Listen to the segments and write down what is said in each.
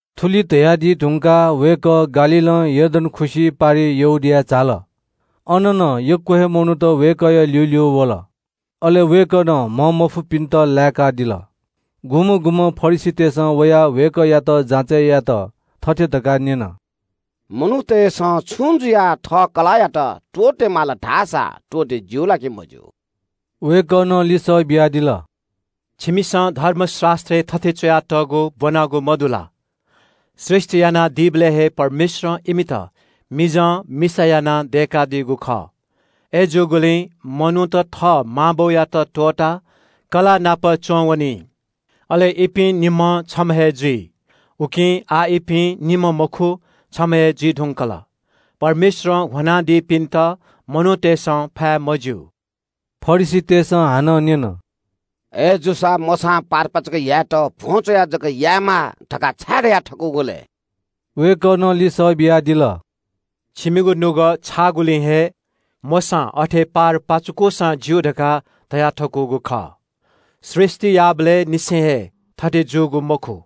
थुलि धयादी धुंकाः वय्‌कः गालीलं यर्दन खुसि पारिइ यहूदियाय् झाल। अन नं ग्‍वाः ग्‍वाः मनूत वय्‌कःया ल्‍यूल्‍यू वल। अले वय्‌कलं म्‍हंमफुपिन्‍त लाय्‌कादिल। सुं फरिसीत वयाः वय्‌कःयात जाँचय् यायेत थथे धकाः न्‍यन – “मनूतय्‌सं छुं जुयाः थः कलाःयात त्‍वःते माल धाःसा त्‍वःते ज्‍यू ला कि मज्‍यू?” वय्‌कलं लिसः बियादिल – “छिमिसं धर्मशास्‍त्रय् थथे च्‍वयातःगु ब्‍वनागु मदु ला? ‘सृष्‍टि यानादीबलय् हे परमेश्‍वरं इमित मिजं मिसा यानाः दय्‌कादीगु खः’ – अय्‌जूगुलिं मनूत थः मां बौयात त्‍वःताः कलाःनापं च्‍वंवनी। अले इपिं निम्‍हं छम्‍ह हे जुइ। उकिं आः इपिं निम्‍ह मखु, छम्‍ह हे जुइ धुंकल। परमेश्‍वरं ह्वनादीपिन्‍त मनूतय्‌सं फाये मज्‍यू।” फरिसीतय्‌सं हानं न्‍यन – “अय्‌जूसा मोशां पारपाचुके यायेत भ्‍वं च्‍वयाः जक यायेमाः धकाः छाय् धयाथकूगु लय्?” वय्‌कलं लिसः बियादिल – “छिमिगु नुगः छाःगुलिं हे मोशां अथे पारपाचुकूसां ज्‍यू धकाः धयाथकूगु खः। सृष्‍टि याःबलय् निसें हे थथे जूगु मखु।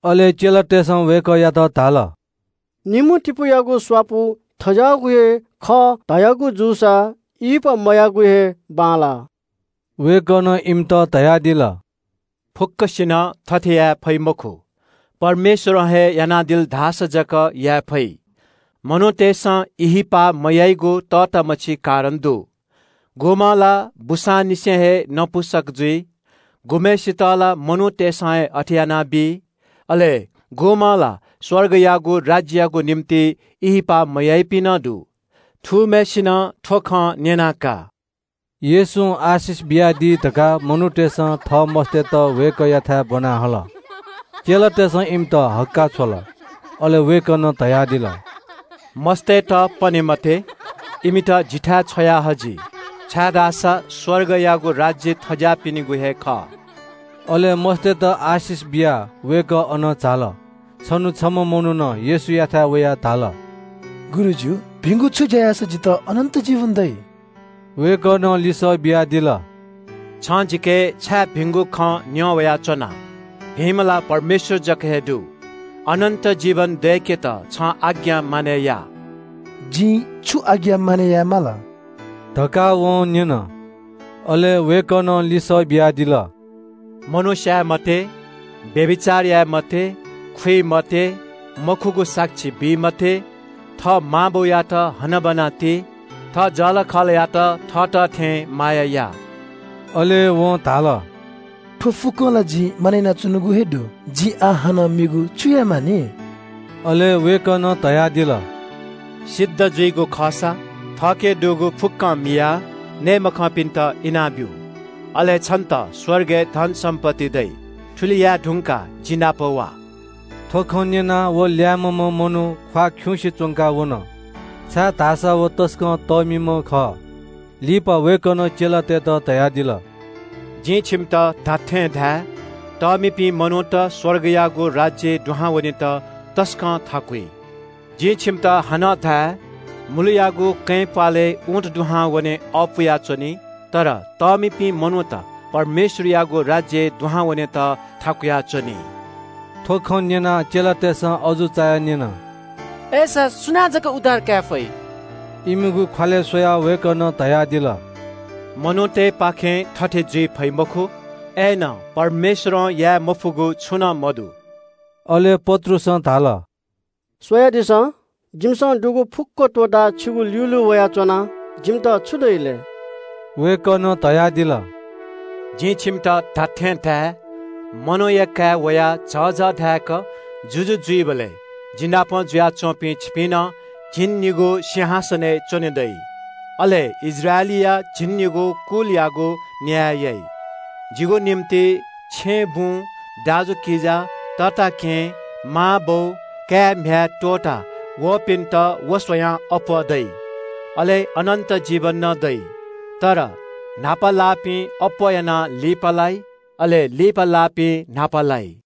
अले चेलातय्‌सं वय्‌कःयात धाल – “निम्‍हतिपूयागु स्‍वापु थज्‍याःगु हे खः धयागु जूसा ब्‍याहा मयायेगु हे बांलाः।” वय्‌कलं इमित धयादिल – “फुक्‍कसिनं थथे याये फइ मखु, परमेश्‍वरं हे यानादिल धाःसा जक याये फइ। मनूतय्‌सं ब्‍याहा मयाइगु तःतामछि कारण दु। गुम्‍हं ला बूसांनिसें हे नपुंसक जुइ, गुम्‍हय्‌सित ला मनूतय्‌सं हे अथे यानाबी। अले गुम्‍हं ला स्‍वर्गयागु राज्‍ययागु निंतिं ब्‍याहा मयाइपिं नं दु। थूम्‍हय्‌सिनं थ्‍व खँ न्‍यना का।” येशूं आशिष बियाः प्रार्थना यानादी धकाः मनूतय्‌सं थः मस्‍तय्‌त वय्‌कःयाथाय् ब्‍वना हल। चेलातय्‌सं धाःसा इमित हक्‍काः छ्वल। वय्‌कलं धयादिल – “मस्‍तय्‌त पने मते। इमित जिथाय् छ्वया हजि, छाय्‌धाःसा स्‍वर्गयागु राज्‍य थज्‍याःपिनिगु हे खः।” अले मस्‍तय्‌त आशिष बियाः वय्‌कः अनं झाल। छन्‍हु छम्‍ह मनुखं येशूयाथाय् वयाः धाल – “गुरुजु, भिंगु छु ज्‍या याःसा जितः अनन्‍त जीवन दइ?” वय्‌कलं लिसः बियादिल – “छिं जिके छाय् भिंगु खँ न्‍यं वयाच्‍वना? भिंम्‍ह ला परमेश्‍वर जक हे दु। अनन्‍त जीवन दय्‌केत छिं आज्ञा मानय् यायेमाः।” “जिं छु आज्ञा मानय् याये माल?” धकाः वं न्‍यन। अले वय्‌कलं लिसः बियादिल – “मनू स्‍याये मते, व्‍यभिचार याये मते, खुइ मते, मखुगु साक्षी बी मते, थः मां बौयात हनाबना ति, थः जःलाखःलायात थःत थें माया या।” अले वं धाल – “थ्‍व फुक्‍कं ला जिं मानय् यानाच्‍वनागु हे दु। जिं आः हानं मेगु छु याये मानि?” अले वय्‌कलं धयादिल – “सिद्ध जुइगु खःसा वनाः थःके दुगु फुक्‍कं मियाः नये मखंपिन्‍त इनाब्‍यु। अले छन्‍त स्‍वर्गय् धनसम्‍पत्ति दइ। थुलि याये धुंकाः जिनापं वा।” थ्‍व खँ न्‍यनाः व ल्‍याय्‌म्‍ह मनू ख्‍वाः खिउँसे च्‍वंकाः वन, छाय्‌धाःसा व तसकं तःमिम्‍ह खः। लिपा वय्‌कलं चेलातय्‌त धयादिल – “जिं छिमित खःगु खँ धाये – तःमिपिं मनूत स्‍वर्गयागु राज्‍यय् दुहां वनेत तसकं थाकुइ। जिं छिमित हानं धाये – मुलुयागु कँय् प्‍वालय् ऊँट दुहां वने अःपुया च्‍वनी तर तःमिपिं मनूत परमेश्‍वरयागु राज्‍यय् दुहां वनेत थाकुया च्‍वनी।” थ्‍व खँ न्‍यनाः चेलातय्‌सं अजू चायाः न्‍यन – “अय्‌सा सुनां जक उद्धार काये फइ?” इमिगु ख्‍वालय् स्‍वयाः वय्‌कलं धयादिल – “मनूतय्‌पाखें थथे जुइ फइ मखु, अय्‌नं परमेश्‍वरं याये मफुगु छुं नं मदु।” अले पत्रुसं धाल – “स्‍वयादिसँ, जिमिसं दुगु फुक्‍क त्‍वःताः छिगु ल्‍यूल्‍यू वयाच्‍वना। जिमित छु दइ लय्?” वय्‌कलं धयादिल – “जिं छिमित खःगु खँ धाये – मनूया काय् वयाः झःझः धाय्‌क जुजु जुइबलय् जिनापं जुयाच्‍वंपिं छिपिं नं झिंनिगू सिंहासनय् च्‍वने दइ। अले इस्राएलीया झिंनिगू कुलयागु न्‍याय याइ। जिगु निंतिं छेँबुँ, दाजुकिजा, तताकेहेँ, मांबौ, काय्‌म्‍ह्याय् त्‍वःतावःपिन्‍त व स्‍वयाः अप्‍वः दइ। अले अनन्‍त जीवन नं दइ। तर न्‍हापा लाःपिं अप्‍वः यानाः लिपालाइ, अले लिपा लाःपिं न्‍हापा लाइ।”